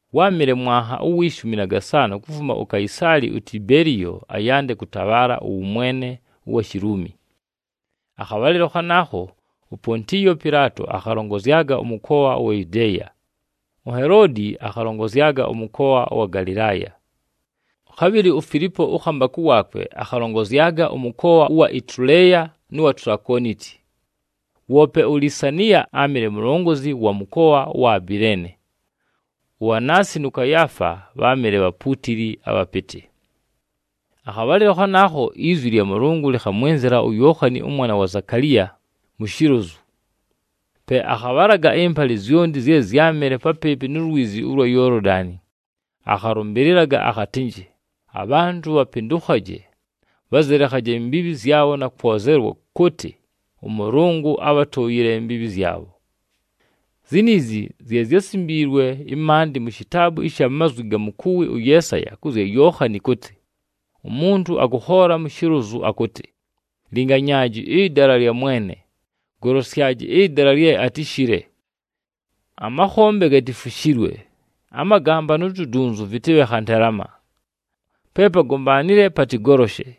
Wáamɨle mwanha uwi shumi na gasaanʉ kufuma uKaisaali uTibeliyo ayande kʉtabhaala ʉwʉmwene ʉwa Shiluumi. Akhabhalɨlo khanaakho uPontiyo Pɨlaato akhalongozyaga ʉmʉkoa ʉwa Yudeeya, uHeloodi akhalongozyaga ʉmʉkoa ʉwa Galɨlaaya. Khabhɨlɨ uFilipo ʉkhambakʉ waakwe akhalongozyaga ʉmʉkoa ʉwa Ituleeya nʉ wa Tulakooniti, woope uLisaniya áamɨle mulongozi wa mʉkoa ʉwa Abileene. UAanasi nʉ Kayaafa bháamɨle bhapuutili abhapɨtɨ. Akhabhalɨlo khanaakho izwi lya Mʉlʉngʉ lɨkhamwɨnzɨla uYookhani ʉmwana wa Zakaliya, mu shilozu. Pe akhabhalaga ɨmbalɨ zyonti zye zyámɨle papɨɨpɨ nu lwizi ʉlwa Yoolodani, akhalʉmbɨlɨlaga akhatɨnjɨ abhantʉ bhapɨndʉkhaje, bhazɨlekhaje imbiibhi zyabho na kwozelwa kʉtɨ, ʉMʉlʉngʉ abhatʉʉyɨle imbiibhi zyabho. Ziniizi zye zyásimbiilwe ɨmaandɨ mu shitaabu ɨsha mazwi ga mukuwi ʉYeesaya kʉ zya Yookhani kʉtɨ, “Umuntu akʉkhoola mu shilozu akʉtɨ, ‘Linganyaaji ɨdala lya Mwene, golosyaji ɨdala lye atɨshɨle. Amakhombe gatifushilwe, amagamba nu tudunyunzu vɨtɨbhe khantelama. Pe pagombaanile patɨgoloshe,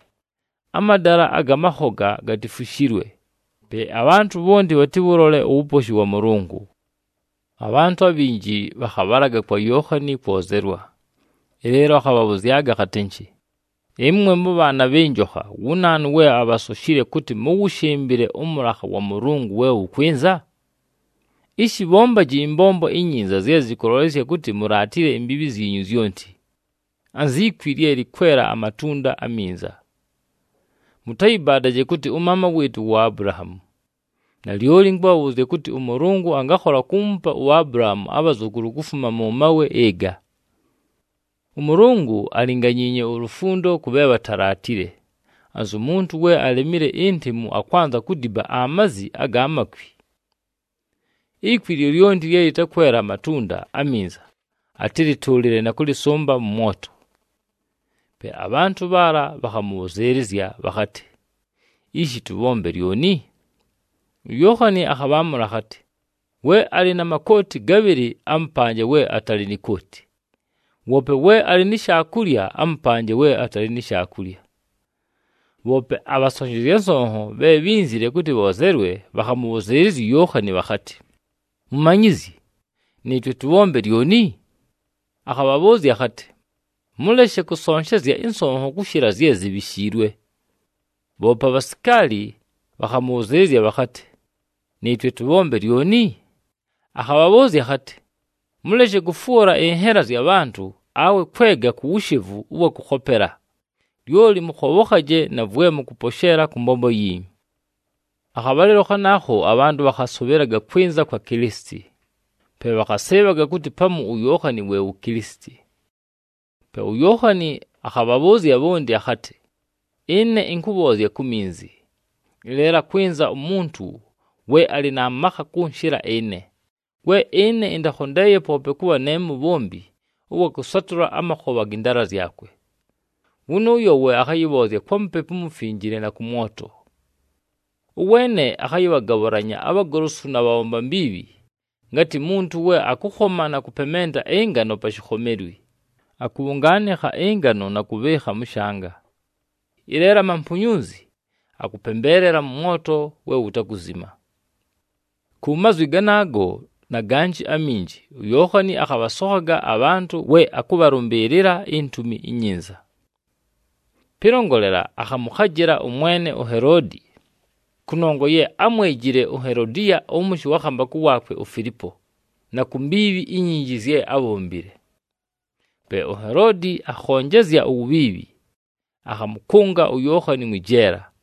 amadala aga makhoga gatifushilwe, pe abhantʉ bhonti bhatɨwʉlole uwuposhi wa Mʉlʉngʉ.’” Abhantʉ abhinji bhakhabhalaga kwa Yookhani kwozelwa, ɨleelo akhabhabhʉzyaga akhatɨnjɨ, “Ɨmwe mʉbhaana bhɨ njokha! Wu naanu we abhasoshile kʉtɨ mʉwʉshɨmbɨle ʉmʉlakha wa Mʉlʉngʉ we wʉkwɨnza? Ishi bhombaji ɨmbombo inyinza zye zɨkʉlolesya kʉtɨ mulaatile imbiibhi zyinyu zyonti, anzi kwi lye lɨkwela amatunda aminza. Mʉtayɨbaadaje kʉtɨ, ‘Ʉmaama wɨɨtʉ wu Abulahaamu!’ Nalyoli ɨnkʉbhabhʉʉzya kʉtɨ, ʉMʉlʉngʉ angakhola kuumupa uAbulahaamu abhazʉkʉlʉ kufuma mʉ mawe ɨga! ɄMʉlʉngʉ alinganyiinye ulufundo kʉ bhe bhatalaatile, anzu muntu we alemile intemu akwanza kudiba amazi aga makwi. Ikwi lyolyonti lye lɨtakwela amatunda aminza, atɨlɨtʉʉlɨle na kʉlɨsʉmba mʉ mwoto.” Pe abhantʉ bhaala bhakhamʉbhʉzɨɨlɨzya bhakhatɨ, “Ishi tʉbhombe lyoni?” UYookhani akhabhaamʉla akhatɨ, “We alɨ na makooti gabhɨlɨ, amʉpanje we atalɨ ni kooti, woope we alɨ ni shaakulya, amʉpanje we atalɨ ni shaakulya.” Bhoope abhasonshezya nsonho bhe bhínzile kʉtɨ bhoozelwe, bhakhamʉbhʉzɨɨlɨzya uYookhani bhakhatɨ, “Mumanyizyi, nɨɨtwe tʉbhombe lyoni?” Akhabhabhʉʉzya akhatɨ, “Mʉleshe kʉsonshezya ɨnsonho kʉshɨla zye zibhishiilwe.” Bhoope abhasikaali bhakhamʉbhʉzɨɨlɨzya bhakhatɨ, “Nɨɨtwe tʉbhombe lyoni?” Akhabhabhʉʉzya akhatɨ, “Mʉleshe kʉfwʉla ɨnhela zya bhantʉ, awe kwega ku wushevu ʉwa kʉkhopela, lyoli mʉkhobhokhaje na vwe mʉkʉposheela kʉ mbombo yiinyu.” Akhabhalɨlo khanaakho abhantʉ bhakhasʉbhɨlaga kwɨnza kwa Kilisiti, pe bhakhasɨɨbhaga kʉtɨ pamu uYookhani we wu Kilisiti. Pe uYookhani akhabhabhʉʉzya bhonti akhatɨ, “Ɨne ɨnkʉbhoozya ku minzi, ɨleelo akwɨnza umuntu we alɨ na makha kʉnshɨla ɨne, we ɨne ɨntakhondeeye poope kʉbha ne mubhombi ʉwa kʉsatʉla amakhobha gɨ ndaala zyakwe. Wʉnʉʉyo we akhayɨbhoozya kwa Mupepu uMufinjile na kʉ mwoto. Ʉweene akhayɨbhagabhʉlanya abhagolosu na bhabhomba mbiibhi, ngatɨ muntu we akʉkhoma na kʉpementa ɨngano pa shikhomelwi, akʉbhʉngaanɨkha ɨngano na kʉbhɨɨkha mʉ shanga, ɨleelo amampunyunzi akʉpembeelela nʉ mwoto we wutakuzima.” Ku mazwi ganaago na ganjɨ aminji uYookhani akhabhasokhaga abhantʉ we akʉbhalʉmbɨɨlɨla iNtumi iNyinza. Pɨlongolela, akhamʉkhajɨla ʉmwene uHeloodi, kʉnongwa ye ámwejile uHelodiya ʉmʉshɨ wa khambakʉ waakwe uFilipo, na ku mbiibhi inyinji zye ábhombile. Pe uHeloodi akhonjezya uwubhiibhi, akhamʉkʉnga uYookhani mwɨ jeela.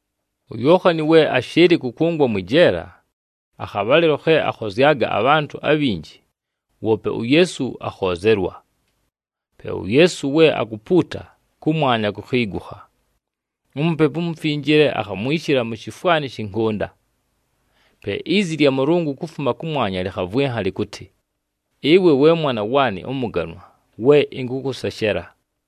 UYookhani we ashɨɨlɨ kʉkʉngwa mwɨ jeela, akhabhalɨlo khe akhozyaga abhantʉ abhinji, woope uYeesu akhoozelwa. Pe uYeesu we akupuuta, kʉmwanya kukhiigukha, uMupepu uMufinjile akhamwishila mu shifwani shɨ nkʉnda. Pe izi lya Mʉlʉngʉ kufuma kʉmwanya lɨkhavwɨnha lɨkʉtɨ, “Ɨwe we Mwana waanɨ ʉmʉganwa, we ɨnkʉkʉseshela.”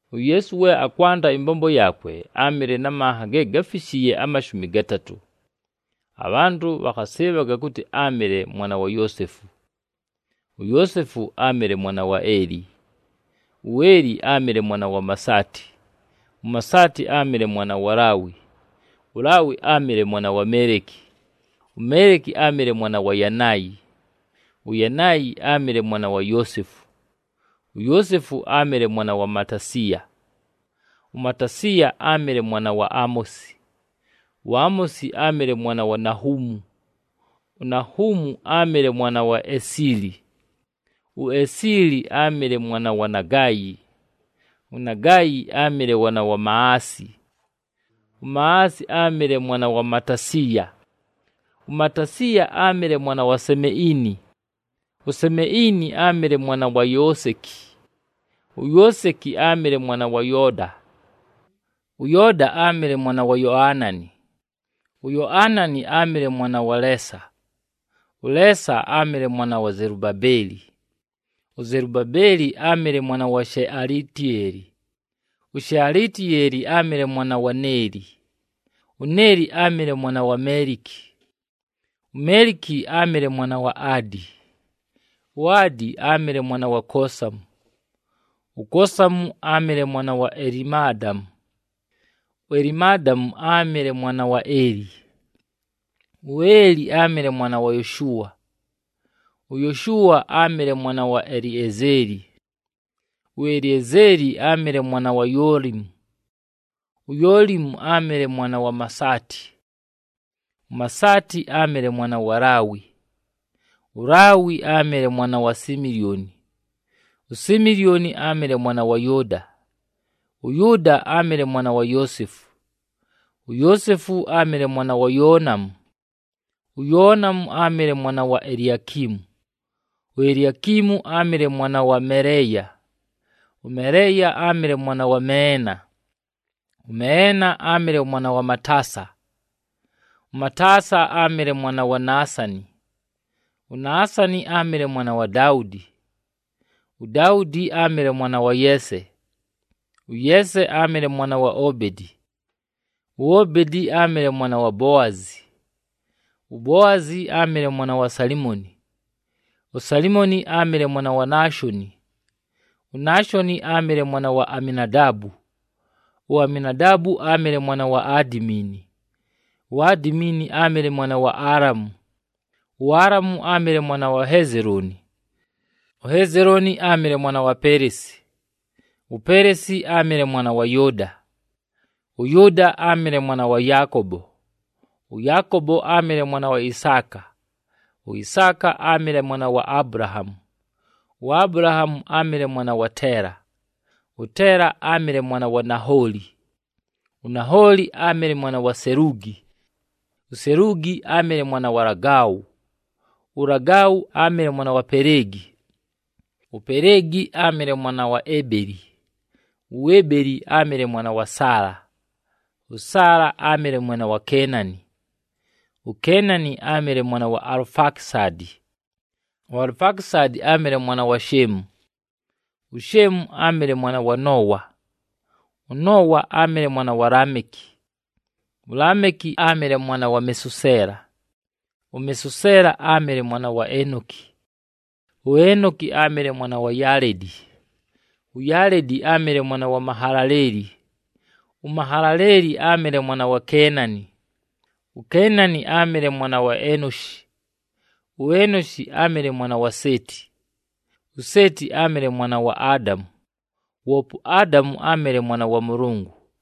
UYeesu we akwanda ɨmbombo yaakwe, áamɨle na manha ge gáfishiiye amashumi gatatʉ. Abhantʉ bhakhasɨɨbhaga kʉtɨ áamɨle mwana wa Yoosefu. UYoosefu áamɨle mwana wa Eli, uEli áamɨle mwana wa Masaati, uMasaati áamɨle mwana wa Laawi, uLaawi áamɨle mwana wa Meeliki, uMeeliki áamɨle mwana wa Yanaayi, uYanaayi áamɨle mwana wa Yoosefu, uYoosefu áamɨle mwana wa Matasiya, uMatasiya áamɨle mwana wa Amosi, uAmosi áamɨle mwana wa Nahuumu, uNahuumu áamɨle mwana wa Esili, uEsili áamɨle mwana wa Nagaayi, uNagaayi áamɨle mwana wa Maasi, uMaasi áamɨle mwana wa Matasiya, uMatasiya áamɨle mwana wa Semeini, uSemeini áamɨle mwana wa Yooseki, uYooseki áamɨle mwana wa Yooda, ʉYooda áamɨle mwana wa Yoanani, uYoanani áamɨle mwana wa Leesa, ʉLeesa áamɨle mwana wa Zelubabeli, uZelubabeli áamɨle mwana wa Shealitiyeeli, uShealitiyeeli áamɨle mwana wa Neeli, uNeeli áamɨle mwana wa Meeliki, uMeeliki áamɨle mwana wa Adi, uAdi áamɨle mwana wa Kosamu, uKosamu áamɨle mwana wa Elimadamu, uElimadamu áamɨle mwana wa Eli, uEli áamɨle mwana wa Yoshua, uYoshua áamɨle mwana wa Eliezeli, uEliezeli áamɨle mwana wa Yoolimu, uYoolimu áamɨle mwana wa Masaati, uMasaati áamɨle mwana wa Laawi, uLaawi áamɨle mwana wa Similyoni, uSimilyoni áamɨle mwana wa Yʉʉda, ʉYʉʉda áamɨle mwana wa Yoosefu, uYoosefu áamɨle mwana wa Yoonamu, uYoonamu áamɨle mwana wa Eliakimu, uEliakimu áamɨle mwana wa Meleeya, ʉMeleeya áamɨle mwana wa Meena, ʉMeena áamɨle mwana wa Mataasa, ʉMataasa áamɨle mwana wa Naasani, uNaasani áamɨle mwana wa Daudi, uDaudi áamɨle mwana wa Yeese, ʉYeese áamɨle mwana wa Obedi, uObedi áamɨle mwana wa Boazi, uBoazi áamɨle mwana wa Salimoni, uSalimoni áamɨle mwana wa Naashoni, uNaashoni áamɨle mwana wa Aminadaabu, uAminadaabu áamɨle mwana wa Adimiini, uAdimiini áamɨle mwana wa Aalamu, uAalamu áamɨle mwana wa Hezelooni, uHezelooni áamɨle mwana wa Peleesi, uPeleesi áamɨle mwana wa Yʉʉda, ʉYʉʉda áamɨle mwana wa Yaakobo, ʉYaakobo áamɨle mwana wa Isaaka, uIsaaka áamɨle mwana wa Abulahaamu, uAbulahaamu áamɨle mwana wa Teela, ʉTeela áamɨle mwana wa Nahooli, uNahooli áamɨle mwana wa Seluugi, uSeluugi áamɨle mwana wa Lagau, uLagau áamɨle mwana wa Peleegi, uPeleegi áamɨle mwana wa Ebeli, uEbeli áamɨle mwana wa Saala, ʉSaala áamɨle mwana wa Keenani, uKeenani áamɨle mwana wa Alufakisadi, uAlufakisadi áamɨle mwana wa Sheemu, uSheemu áamɨle mwana wa Noowa, ʉNoowa áamɨle mwana wa Laameki, uLaameki áamɨle mwana wa Mesuseela, uMesuseela áamɨle mwana wa Enoki, uEnoki áamɨle mwana wa Yaaledi, uYaaledi áamɨle mwana wa Mahalaleeli, uMahalaleeli áamɨle mwana wa Keenani, uKeenani áamɨle mwana wa Enoshi, uEnoshi áamɨle mwana wa Seeti, uSeeti áamɨle mwana wa Adamu, woope uAdamu áamɨle mwana wa Mʉlʉngʉ.